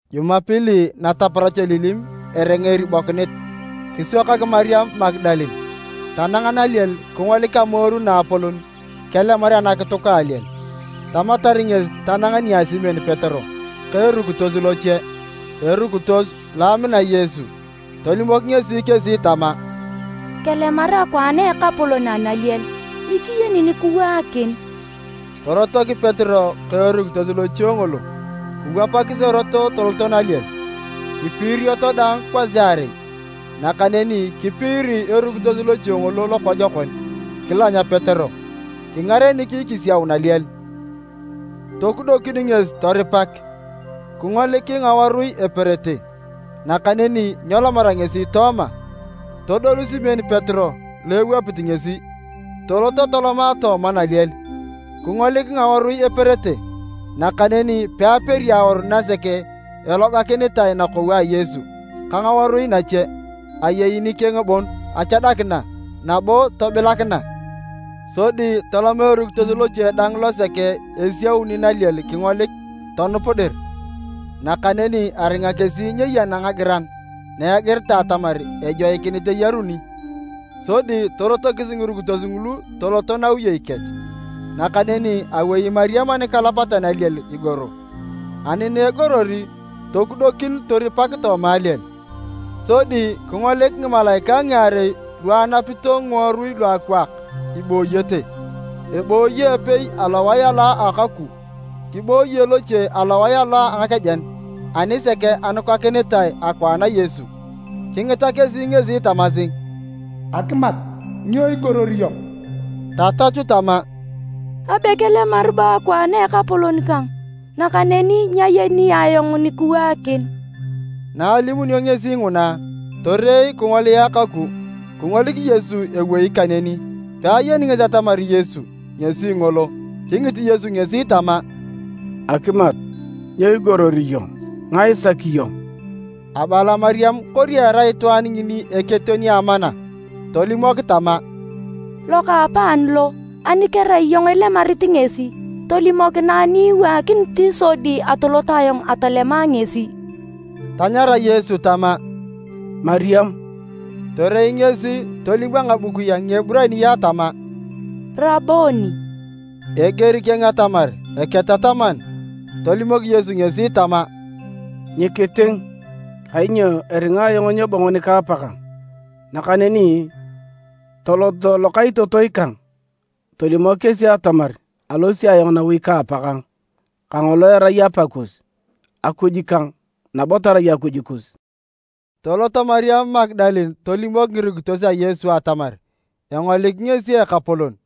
Jumapili nataparach elilim eringa eribokinit, kiswakak Mariam Magadalene. Tanang naliel kingolik amoru naapolon kelemar anakituk a aliel. Tamatar ngesi tanang nia Simon Petero ka erukitos loche, erukitos lo amina Yesu. Tolimok ngesi kesi tama, “Kelemar akwaan a Ekapolon analiel, nyikiyeni nikiwaakin!” Torotok Petero ka erukitos loche ngolo kiwapakis erot toloto naliel. Kipiirioto daang kwasiarei, nakaneni kipiiri erukitos loche ngolo lokojokon kilany Petero, kingarenik kisiau naliel. Tokudokin ngesi toripak, kingolik ngawarui eperete, nakaneni nyelomara ngesi tooma. Todolu Simon Petero lo ewapit ngesi, tolot toloma tooma naliel kingolik ngawarui eperete, nakaneni peaperi awaru nasek elogakinitae nakou a Yesu ka ngawarui nache. Ayei nikeng bon achadakina, nabo tobilakina. Sodi toloma erukitos loche dang losek esiauni naliel kingolik, tonup dir. ( Nakaneni aringa kesi nyeyana ngagiran na egiritae atamar ejoikinit eyaruni.) Sodi torotokis ngirukitos ngulu toloto nawiyei kech. Nakaneni awei Mariam anikalapatan a aliel igoro. Ani na egoror, tokudokin toripak tooma aliel. Sodi kingolik ngimalaikae ngiarei lu anapito ngiworui luakwaak ibooyete. Ebooyi epei alowae alo a akou, kibooye loche alowae alo a ngakejen, anisek anukakinitae akwaan a Yesu. Kingita kesi ngesi tamasi, “Akimat, nyo igoror iyong?” Tatachu tama, “Abe kelemar bo akwaan a Ekapolon kang, nakaneni nyayeni ayong nikiwaakin!” Na alimunio ngesi nguna, torei kingolia kaku, kingolik Yesu ewei kaneni, peayeni ngesi atamar Yesu ngesi ngolo. Kingit Yesu ngesi tama, “Akimat, nyo igoror iyong? Ngae isaki iyong?” Abala Mariam kori erai itwaan ngini eketeon a amana, tolimok tama, “Lokaapaan lo, ani kerai iyong ilemarit ngesi, tolimokinae ni iwaakinit sodi atolot ayong atolema ngesi.” Tanyara Yesu tama, “Mariam!” Torei ngesi tolim a ngabukui a Ngieburaniae tama, “Raboni!” (Eger keng atamar, “Eketataman.”) Tolimok Yesu ngesi tama, “Nyikiting, kainyo eringa ayong nyebongo nika Apakang. Nakaneni tolot lokaitotoi kang, tolimok kesi atamar alosi ayong nawi ka Apakang, kangolo erai Apa kus, Akuj kang, nabo tarai Akuj kus.” Tolot Mariam Magadalene tolimok ngirukitos a Yesu atamar engolik ngesi Ekapolon.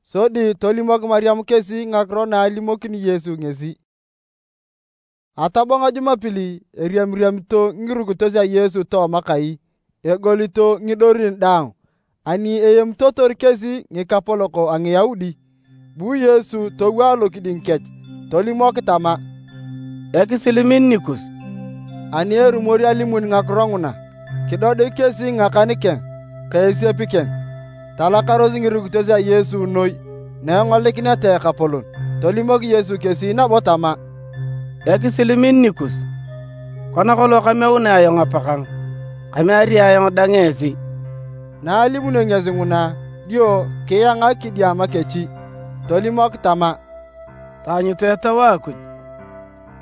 Sodi tolimok Mariam kesi ngakiro na alimokini Yesu ngesi. Atabong a Jumapili, eriamiriamito ngirukitos a Yesu tooma kai, egolito ngidorin daang ani aemitotor kesi ngikapolok a Ngiyaudi. Bu Yesu towo alokiding kech, tolimok tama, “Ekisil min nikus.” Ani erumori alimun ngakiro nguna, kidodik kesi ngakan keng ka esiep keng. Talakaros ngirukitos a Yesu noi na engolikineta Ekapolon. Tolimok Yesu kesi nabo tama, “Ekisil min nikus. Kona kolong kameunea ayong Apakang, kameari ayong dang esi.” Na alimunio ngesi nguna, dio kiangak kidiama kech, tolimok tama, “Taanyutu Etau a Akuj.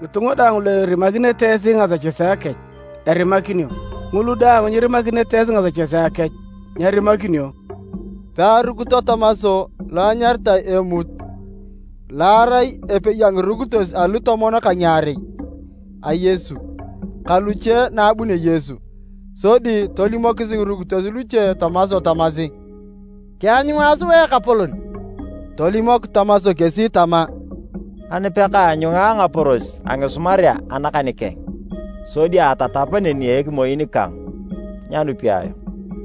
Ngitunga daang lu irimakinete esi ngasechesea kech, erimakinio, ngulu daang nyirimakinete esi ngasechesea kech, nyerimakinio.” Pearukito Tomas (lo enyaritae Emuut) lo arai epei a ngirukitos alutomon ka ngiarei a Yesu ka luche na abunio Yesu. Sodi tolimokis ngirukitos luche Tomas tamasi, “Kianyunga sua Ekapolon!” Tolimok Tomas kesi tama, “Ani pekaanyunga ngaporos a ngisumarea anakan keng, sodi atatap neni a ekimoin kang, nyanupi ayong.”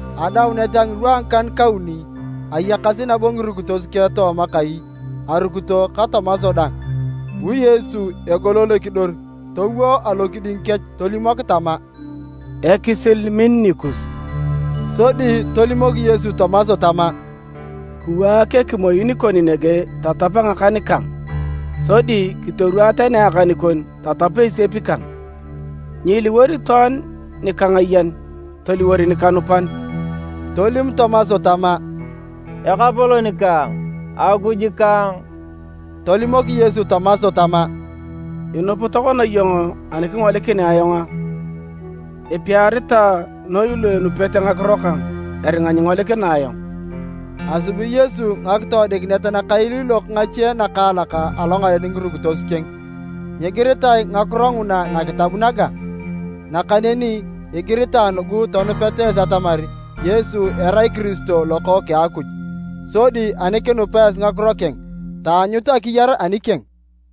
Adaunet a ngirwa a ngikan-kauni, ayakasi nabo ngirukitos keng tooma kai arukito ka Tomas dang. Bu Yesu egolol ekidor towo alokiding kech, tolimok tama, “Ekisil min nikus.” Sodi tolimok Yesu Tomas tama, “Kiwaak ekimoin kon nege tatap ngakan kang, sodi kitorwaa tani akan kon tatap esiep kang. Nyiiliwor itwaan nikangayan, toliwor nikanupan!” Tolim Tomas tama, “Ekapolon kang! Akuj kang!” Tolimok Yesu Tomas tama, “Inup tokona iyong ani kingolikinea ayong a? Epiaritae noi lu enupete ngakiro kang eringa nyingolikina ayong!” Asubi Yesu ngakitoodikinet nakailiilok ngache nakaalak alongaren ngirukitos keng, nyigiritae ngakiro nguna nakitab naga. Nakaneni igiritae nugu tonupeta esi atamar Yesu erai Kiristo Lokookeng a Akuj, sodi ani kinupa esi ngakiro keng, taanyut akiyar anikeng.